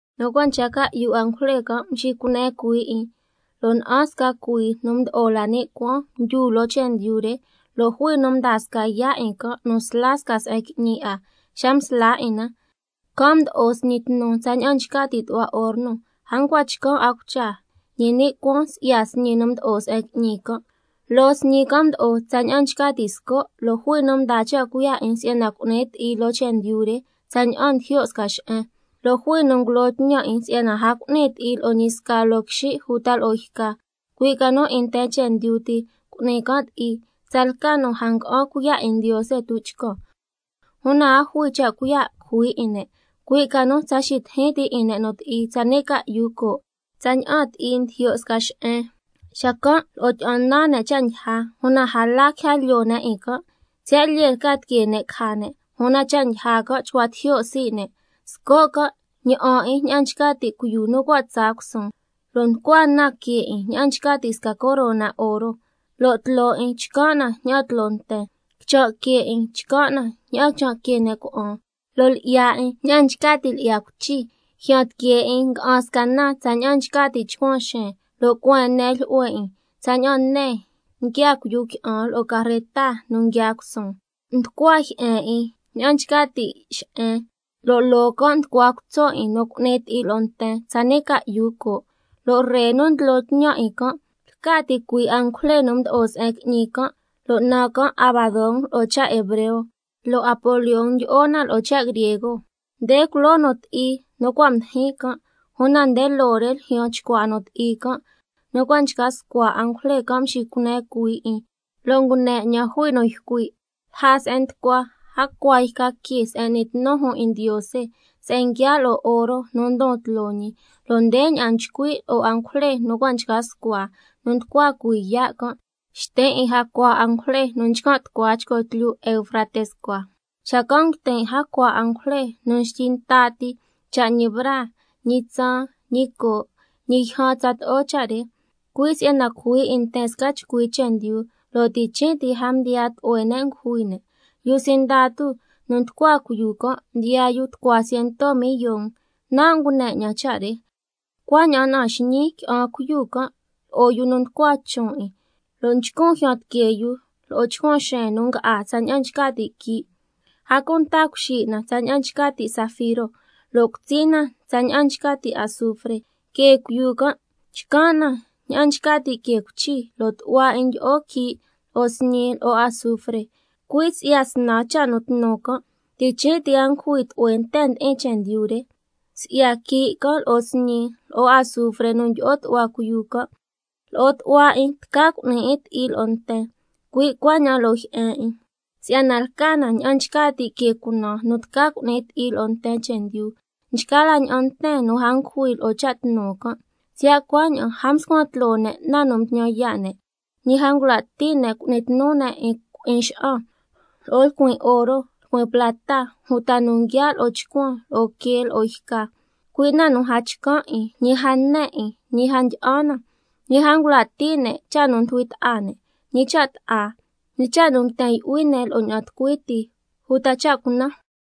Nu cua' nchca ca'yu angujle can' mxicune cuhuii 'in, lo' na'an sca cuii nu mdo'o la ni' cuaan mdyu loo chendyu re, lo' jui nu mdaa sca yaa' 'in can' nu sla sca se'en qui'ñi 'a. Xa msla 'in na, can' mdo'o sñi tnu tsaña'an nchca ti' tu'hua horno, a ncua chcan' 'a cucha, ñi ni' cuaan si'ya sñi nu mdo'o se'en qui'ñi can'. Loo sñi can' mdo'o tsaña'an nchca ti' sco', lo' jui nu mdaa cha' cuiya' si'yana cu'ni 'in ti'i loo chendyu re tsaña'an ndijyo' sca xe'en. Lo' jui nu ngulo tñan 'in si'yana a cu'ni ti'i lo'o ñi sca loo quixin' uta lo'o yca, cui' ca nu 'in nten chendyu ti cu'ni can' ti'i, tsalca nu a nga'an cuiya' 'in Ndiose tuchcan. Una a jui cha' cuiya' cujui 'in ne', cui' ca nu tsa xitijin ti 'in ne' nu ti'i tsani' ca'yu coo', tsaña'an ti'i ndijyo' sca xe'en. Xacan' lo'o tyi'an nan ne' cha' ndyija, una a la quija lyoo ne' 'in can', siya' lyee lca tiquee ne' caja ne', una cha' ndyija can' chcua tijyo' sii' ne'. Sco' can' ña'an 'in ña'an nchca ti' cuiyu nu cua' tsaa cusuun, lo' nducua na que 'in ña'an nchca ti' sca corona oro, lo' tloo 'in chcan' na ña'an tloo nten, quichan' que 'in chcan' na ña'an quichan' que ne' cuna'an, lo' lyi'ya 'in ña'an nchca ti' lyi'ya cuichi, jyan tiquee 'in nga'an sca na tsaña'an nchca ti' chcuan xeen, lo' cueen ne jlyu'hue 'in tsaña'an ne nguiaa cuiyu qui'an lo'o carreta nu nguiaa cusuun. Nducua jyi'en 'in ña'an nchca ti' xe'en, lo' loo can' nducua cutso' 'in nu cu'ni ti'i lo'o nten tsani' ca'yu coo'. Lo' ree nu ndlo tñan 'in can' lca ticui' angujle nu mdo'o se'en qui'ñi can', lo' naan can' Abadón lo'o cha' hebreo, lo' Apolión ndyi'o na lo'o cha' griego. Nde culoo nu ti'i nu cua' mdijin can', una nde loo re ljyaan chcua nu ti'i can'. Nu cua' nchca scua angujle can' mxicune cuhuii 'in, lo' ngune 'ñan jui nu ycui' lja se'en nducua jacua yca que se'en n'ni tnu jun 'in Ndiose, se'en nguiaa' lo'o oro nu ndon tloo ñi, lo' ndeña'an nchcui' lo'o angujle nu cua' nchca scua nu nducua cuhuii yaa' can': Xtin' 'in jacua angujle nu nchcan' tu'hua chco tlyu Eufrates cua. Xacan' nguitin' jacua angujle nu xtyi nta ti cha' ñi braa, ñi tsaan, ñi coo', ñi yjan tsato'o cha' re, cui' si'yana cujui 'in nten sca chcui chendyu, lo' ti' chin' ti a mdiyaa tlu'hue ne' ngujui ne'. Yu sindatu nu nducua cuiyu can' ndiyaa yu tucua ciento millon, nan' ngune 'ñan cha' re. Cuaña'an na'an xñiin qui'an cuiyu can' lo'o yu nu nducua chon' 'in, lo' nchcun jyan tiquee yu lo'o chcuan xeen nu nga'á tsaña'an nchca ti' quii', a cunta cuxi' na tsaña'an nchca ti' zafiro, lo' cutsi na tsaña'an nchca ti' azufre. Que cuiyu can' chcan' na ña'an nchca ti' que cuichi, lo' tu'hua 'in ndyi'o quii' lo'o sñi lo'o azufre. Cui' si'ya snan cha' nu tnu can', chin' ti a ngujui tlu'hue nten ndi'in chendyu re, si'ya quii' can', lo'o sñi, lo'o azufre nu ndyi'o tu'hua cuiyu can'. Si'yana lo'o tu'hua 'in tca cu'ni 'in ti'i lo'o nten, cui' cuaña'an lo'o jyi'en 'in, si'yana lca na ña'an nchca ti' que cunaan nu tca cu'ni ti'i lo'o nten chendyu. Nchgaa la ña'an nten nu a ngujui lo'o cha' tnu can', siya' cuaña'an a mscuan tloo ne' na nu mtñan yaa' ne', ñi a ngula' ti' ne' cu'ni tnu ne' 'in cui'in xa'an, lo'o lcuin oro, lcuin plata, uta nu nguiaa' lo'o chcuan, lo'o quee, lo'o yca, cui' na nu a chcan' 'in, ñi a ne 'in, ñi a ndyi'an na. Ñi a ngula' ti' ne' cha' nu ndujui ta'a ne', ñi cha' bta'a, ñi cha' nu nguiten yu'hui ne' lo'o ña'an tucui ti, uta cha' cunan.